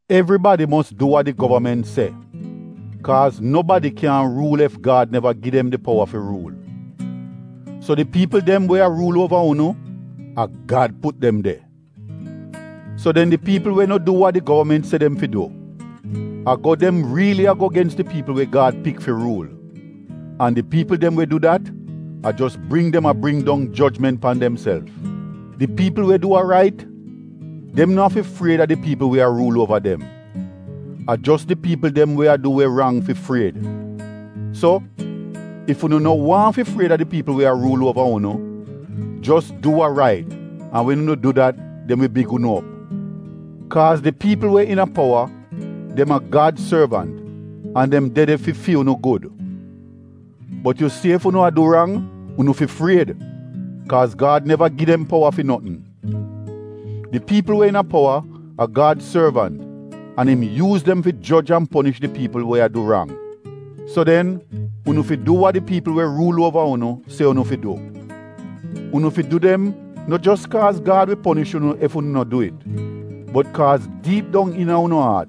Evribadi mos du wa di govament se kaaz nobadi kyaahn ruul ef Gad neva gi dem di powa fi ruul. So di piipl dem we a ruul uova unu, a Gad put dem de. So den di piipl we no du wa di govament se dem fi du, a go dem riili a go gens di piipl we Gad pik fi ruul, an di piipl dem we du dat, a jos bring dem a bring dong jojment pan demself. Di piipl we du wa rait, dem no afi fried a di piipl we a ruul uova dem. A jos di piipl dem we a du we rang fi fried. So, ef unu no waahn fi fried a di piipl we a ruul uova unu, jos du wa rait an wen unu du dat dem wi big unu op. Kaaz di piipl we iina powa, dem a Gad sorvant an dem de de fi fi unu gud. Bot yu si ef unu a du rang, unu fi fried, kaaz Gad neva gi dem powa fi notn. Di piipl we iina powa a Gad sorvant an im yuuz dem fi joj an ponish di piipl we a du rang. So den unu fi du wa di piipl we ruul uova unu se unu fi du. Unu fi du dem no jos kaaz Gad wi ponish unu ef unu no du it bot kaaz diip dong iina unu aat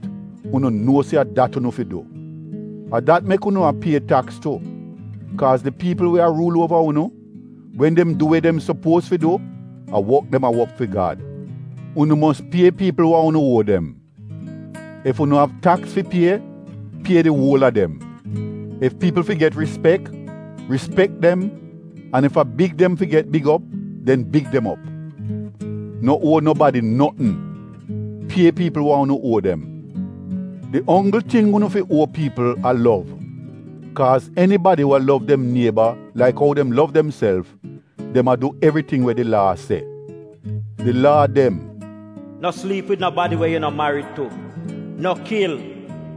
unu nuo se a dat unu fi du. A dat mek unu a pie taks tu, kaaz di piipl we a ruul uova unu, wen dem du we dem sopuoz fi du, a wok dem a wok fi Gad. Unu mos pie piipl wa unu uo dem: Ef unu av taks fi pie, pie di uol a dem; ef piipl fi get rispek, rispek dem an ef a big dem fi get big op, den big dem op. No uo nobadi notn — pie piipl wa unu uo dem. Di onggl ting unu fi uo piipl a lov kaaz enibadi we lov dem nieba laik ou dem lov demself, dem a du evriting we di Laa se. Di Laa dem: “No sliip wid nobadi we yu no marid tu, no kil,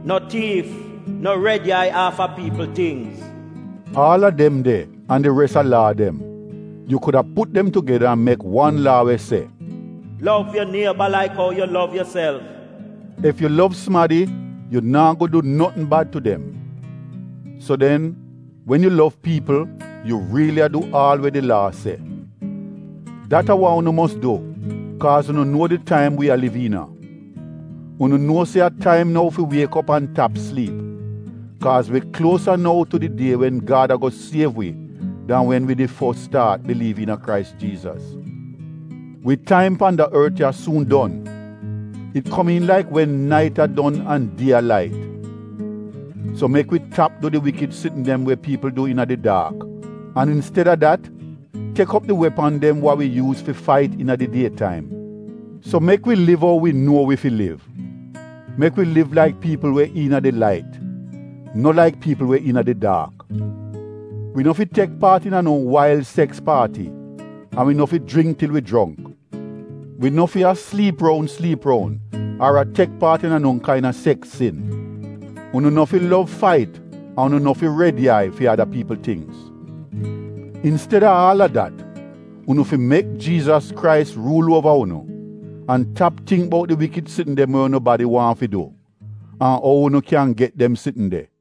no tiif, no red yai aafa piipl tingz,” aal a dem de an di res a Laa dem, yu kuda put dem tugeda an mek wan Laa we se: “Lov yu nieba laik ou yu lov yuself.” Ef yu lov sumadi yu naa go du notn bad tu dem. So den, wen yu lov piipl, yu riili a du aal we di Laa se. Dat a wa unu mos du kaaz unu nuo di taim wi a liv iina. Unu nuo se a taim nou fi wiek op an tap sliip, kaaz wi kluosa nou tu di die wen Gad a-go siev wi dan wen wi did fos staat biliiv iina Krais Jiizas. Wi taim pan da ort ya suun don, it komiin laik wen nait a don an die a lait. So mek wi tap du di wikid sitn dem we piipl du iina di daak an insted-a dat tek op di wepan dem wa wi yuuz fi fait iina di die taim. So mek wi liv ou wi nuo wi fi liv, mek wi liv laik piipl we iina di lait, no laik piipl we iina di daak. Wi no fi tek paat iina no wail seks paati an wi no fi jringk til wi jongk. Wi no fi a sliip roun sliip roun ar a tek paat iina no kain-a seks sin. Unu no fi lov fait an unu no fi red yai fi ada piipl tingz. Insted-a aal a dat, unu fi mek Jiizas Krais ruul uova unu an tap tingk bout di wikid sitn dem we unu badi waahn fi du an ou unu kyan get dem sitn de.